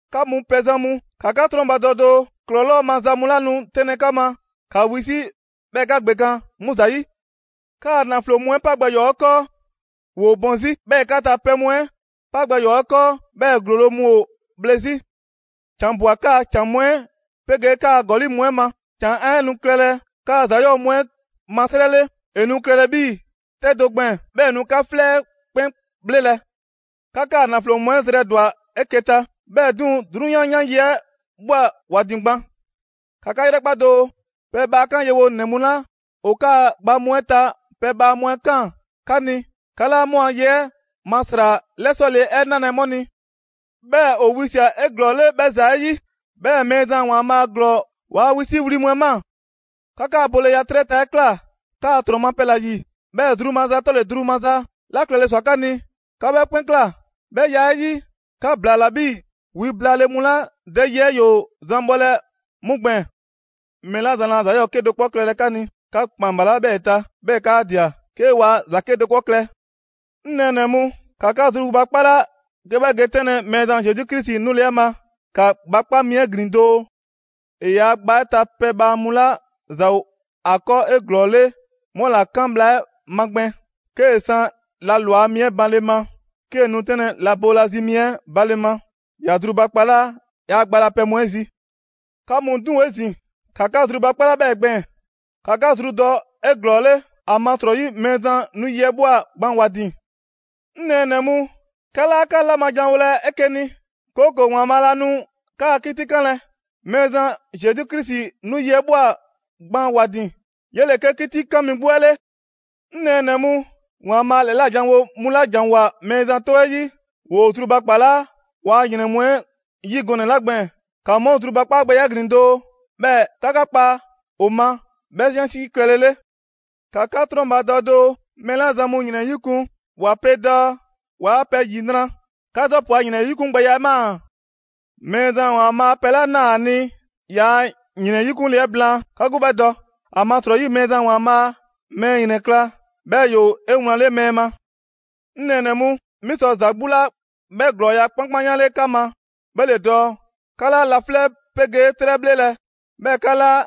'Ka mu pɛzan mu, ‑ka 'ka 'trɔnbadɔ doo! ‑Klɔlɔɔ' maza mu 'la nu 'tɛnlɛ‑ 'ka ma, ‑ka wisi' 'bhɛɛ‑ ‑ka ‑gbekan' 'mu ‑zayi'. 'Kaa‑ ‑naflo mu 'ɛ 'pa gbɛ ‑yɔɔ 'ɛ 'kɔɔ, ‑woo bɔn 'zi. 'Bhɛɛ‑ 'ka ta pɛ mu 'ɛ 'pa gbɛ ‑yɔɔ 'ɛ 'kɔɔ, 'bhɛɛ‑ ‑glolo' mu ‑o bhle 'zi. ‑Can ꞊bwa 'kaa‑ ‑can mu 'ɛ 'pegee 'kaa‑ ‑gɔli' mu 'ɛ ma. ‑Can 'ɛ nu klɛlɛ 'kaa‑ ‑za 'yɔɔ‑ mu 'ɛ ma 'srɛ 'le. ‑E nu klɛlɛ 'bhii‑ 'tɛ do gbɛɛn‑, 'bhɛɛ‑ ‑e nu 'ka 'flɛ 'ɛ 'kpɛn 'bhlelɛ‑. 'Ka 'kaa‑ ‑naflo mu 'ɛ zrɛ ‑dwa 'eke‑ ta, 'bhɛɛ‑ 'duŋ‑ 'drunyan 'yan yi 'ɛ ꞊bhwa ‑wa ‑din gban. ‑Ka 'ka 'yrɛkpa doo! Pɛbhaa 'kan yewonɛ mu 'la ‑o 'kaa‑ gba mu 'ɛ ta pɛbhaa mu 'ɛ 'kaan‑ 'ka ni, 'ka 'laa 'mu a ye 'ɛ ma ‑sra 'lɛsɔle 'ɛ 'nalɛ‑ 'mu ni. 'Bhɛɛ‑ ‑o wisia꞊ 'eglɔɔle 'bhɛ ‑za 'ɛ 'yi, 'bhɛɛ‑ Mɛɛzan ‑Waanbhaa' ‑Glɔɔ ‑waa' wisiwli mu 'ɛ ꞊maa. 'Ka 'kaa‑ boleya 'trɛ ta 'ɛ ꞊kla 'kaa‑ ‑trɔn ma pɛ ‑la ‑yi, 'bhɛɛ‑ zru maza 'tɔle‑ zru maza 'la klɛle ꞊swa 'ka ni, 'ka 'bhɛɛ‑ 'kpɛn ꞊kla. 'Bhɛ ya 'ɛ 'yi, 'ka ‑blaala 'bhii‑ wi blaale mu 'la dɛ yi 'ɛ ‑yoo zan bhɔlɛ 'mu gbɛɛn‑. Mɛɛ 'la zan laa ‑za 'yɔɔ‑ 'kedo‑ 'kpɔ klɛlɛ 'ka ni, 'ka ‑kpan ‑balaa' 'bhɛɛ‑ ta, 'bhɛɛ‑ 'kaa ꞊dia, 'ke waa ‑za 'kedo‑ 'kpɔ klɛ. 'Ŋ nɛɛnɛ‑ mu, ‑ka 'ka zrubakpala 'ke 'bhɛ ge 'tɛnlɛ‑ Mɛɛzan Zesu Krisi 'nule‑ 'ɛ ma. ‑Ka gba 'kpa mi 'ɛ ‑glin doo: ‑E yaa gba 'ɛ ta pɛbhaa mu 'la ‑za ‑o ‑a 'kɔɔ 'eglɔɔle 'mu ‑la 'kan bhla 'ɛ magbɛn. 'Kee‑ san la ‑lwa mi 'ɛ banle ma, 'kee‑ nu 'tɛnlɛ‑ la boolazi mi 'ɛ banle ma, ‑ya zrubakpalaa ‑yaa' gba la pɛ mu 'ɛ zi. 'Ka mu 'duŋ‑ 'ezin‑, ‑ka 'ka zrubakpala 'bhɛɛ‑ gbɛɛn‑, ‑ka 'ka zru dɔ 'eglɔɔle, ‑amasrɔyi Mɛɛzan 'nu yi 'ɛ ꞊bhwa gban ‑wa ‑din. 'Ŋ nɛɛnɛ‑ mu, 'ka 'laa 'ka 'la ma janwolɛ 'eke‑ ni, 'kooko‑ ‑Waanbhaa' laa nu 'ka 'kitikanlɛ. Mɛɛzan Zesu Krisi 'nu yi 'ɛ ꞊bhwa gban ‑wa ‑din, 'yele‑ 'ke 'Kitikan mi 'gbu 'ɛ 'le. 'Ŋ nɛɛnɛ‑ mu, ‑Waanbhaa' ‑lɛla' janwo mu 'la ‑janwoa Mɛɛzan 'tɔ 'ɛ 'yi, ‑woo zrubakpalaa ‑waa' ‑yrɛn mu 'ɛ 'yi gɔnɛ‑ 'la gbɛɛn‑, ‑ka 'mu a zrubakpaagbɛya 'ɛ ‑glin doo, 'bhɛɛ‑ 'ka 'ka 'kpa ‑o ma 'bhɛ 'yansi klɛlele. ‑Ka 'ka 'trɔnbadɔ doo! Mɛɛ 'la zan mu ‑yrɛn 'yikun‑, 'wa pe dɔɔ waa pɛ ‑yinra'. 'Ka Zɔbu a ‑yrɛnyikungbɛya 'ɛ ꞊maa. Mɛɛzan ‑Waanbhaa' pɛ 'la ꞊naa ‑a ni ‑yaa' ‑yrɛn 'yikunle 'ɛ blaan, 'ka 'gbu 'bhɛ dɔ. ‑Amasrɔyi Mɛɛzan ‑Waanbhaa' mɛɛ ‑yrɛnkla', 'bhɛɛ‑ ‑yoo 'ewlanle mɛɛ ma. 'Ŋ nɛɛnɛ‑ mu, 'mi sɔ ‑za 'gbu 'la 'bhɛ ‑glɔɔya' 'kpankpanyanle 'ka ma, 'bhɛ ‑le dɔɔ 'ka 'laa laflɛ' 'pegee 'trɛ 'bhlelɛ‑, 'bhɛɛ‑ 'ka 'laa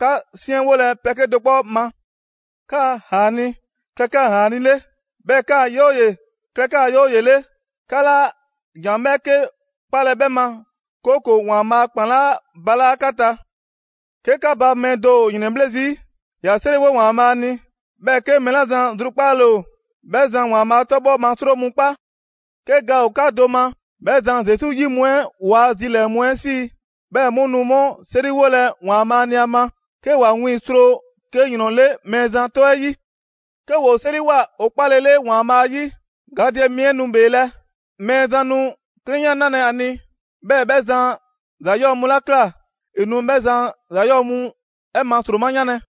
'ka 'siɛnwolɛ pɛ 'kedo‑ 'kpɔ ma. 'Kaa‑ «‑Aani'» klɛ 'kaa‑ «‑Aani'» 'le. 'Bhɛɛ‑ 'kaa‑ «'Yooye‑» klɛ 'kaa‑ «'Yooye‑» 'le! 'Ka 'laa ‑jan 'bhɛɛke 'kpalɛ‑ 'bhɛ ma, 'kooko‑ ‑Waanbhaa' a ‑kpan 'laa balaa' 'ka ta. 'Ke 'ka ba mɛɛ do ‑o ‑yrɛnbhle' zii', ‑ya 'seriwo ‑Waanbhaa' ni. 'Bhɛɛ‑ 'ke mɛɛ 'la zan zrukpaale ‑o, 'bhɛ zan ‑Waanbhaa' 'tɔbhɔ ma 'sro mu 'kpa. 'Ke ga ‑o 'ka do ma, 'bhɛ zan Zesu 'yi mu 'ɛ ‑waa' zilɛɛ‑ mu 'ɛ 'sii‑. 'Bhɛ mu nu 'mu 'seriwolɛ ‑Waanbhaa' ni ‑a ma, 'ke ‑wa wiiŋ‑ sro 'ke ‑yrɔn 'le Mɛɛzan 'tɔ 'ɛ 'yi. 'Ke ‑woo 'seriwoa ‑o 'kpalele ‑Waanbhaa' 'yi, gadɛ mi 'ɛ nu ‑bheelɛ'. Mɛɛzan nu 'klɛnya 'nalɛ‑ ‑a ni, 'bhɛɛ‑ 'bhɛ zan ‑za 'yɔɔ‑ mu 'la ꞊kla, ‑e nu 'bhɛ zan a ‑za 'yɔɔ‑ mu 'ɛ ma ‑sroma 'yanlɛ‑.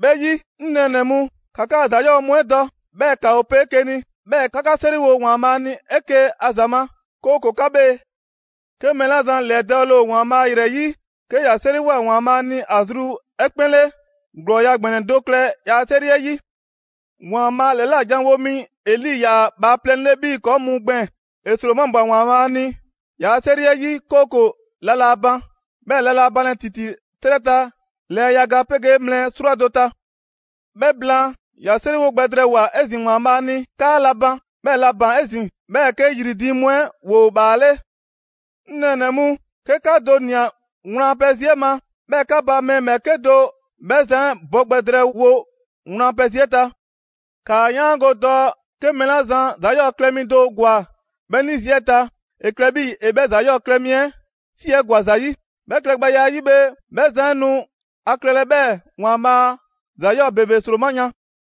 'Bhɛ 'yi, 'ŋ nɛɛnɛ‑ mu, ‑ka 'kaa‑ ‑za 'yɔɔ‑ mu 'ɛ dɔ, 'bhɛɛ‑ 'ka ‑o pe 'eke‑ ni. 'Bhɛɛ‑ ‑ka 'ka 'seriwo ‑Waanbhaa' ni 'eke‑ a ‑za ma, 'kooko‑ 'ka bhee. 'Ke mɛɛ 'la zan ‑lɛdɔɔle ‑o ‑Waanbhaa' ‑yrɛ 'yi, 'ke ‑ya 'seriwoa ‑Waanbhaa' ni ‑a zru 'ɛ 'kpɛn 'le, ‑glɔɔya' ‑gbɛnɛ do klɛ ‑yaa' 'seri 'ɛ 'yi. ‑Waanbhaa' ‑lɛla' janwo mi Eli ‑yaa bhaaplɛŋ 'le 'bhii‑ ‑kɔɔ' mu gbɛɛn‑: ‑E ‑sromabwa ‑Waanbhaa' ni ‑yaa' 'seri 'ɛ 'yi, 'kooko‑ la laa ban, 'bhɛɛ‑ la laa banlɛ ‑titi 'trɛ ta lɛɛ yaga 'pegee mlɛ 'srwado‑ ta. 'Bhɛ blaan, ‑ya 'seriwo gbɛ drɛɛwoa‑ 'ezin‑ ‑Waanbhaa' ni 'kaa la ban, 'bhɛɛ‑ la ‑baan 'ezin‑. 'Bhɛɛ‑ 'ke ‑yri diiŋ mu 'ɛ ‑woo ‑bhaale'. 'Ŋ nɛɛnɛ‑ mu, 'ke 'ka do ꞊nia wlan a pɛ zi 'ɛ ma, 'bhɛɛ‑ 'ka ba mɛɛ ‑bhɛɛke' do 'bhɛ zan 'ɛ bɔ gbɛ drɛɛwo wlan a pɛ zi 'ɛ ta. ‑Kaa 'yaango‑ dɔɔ 'ke mɛɛ 'la zan ‑za 'yɔɔ‑ klɛ mi do ‑gwa 'bhɛ 'ni zi 'ɛ ta, ‑e klɛ 'bhii‑ ‑e 'bhɛ ‑za 'yɔɔ‑ klɛ mi 'ɛ 'si 'ɛ ‑gwa ‑za 'yi. 'Bhɛ klɛgbɛya 'ɛ 'yi bhe, 'bhɛ zan 'ɛ nu ‑a klɛlɛ 'bhɛɛ‑ ‑Waanbhaa' ‑za 'yɔɔ ‑bebe 'sroma‑ yan.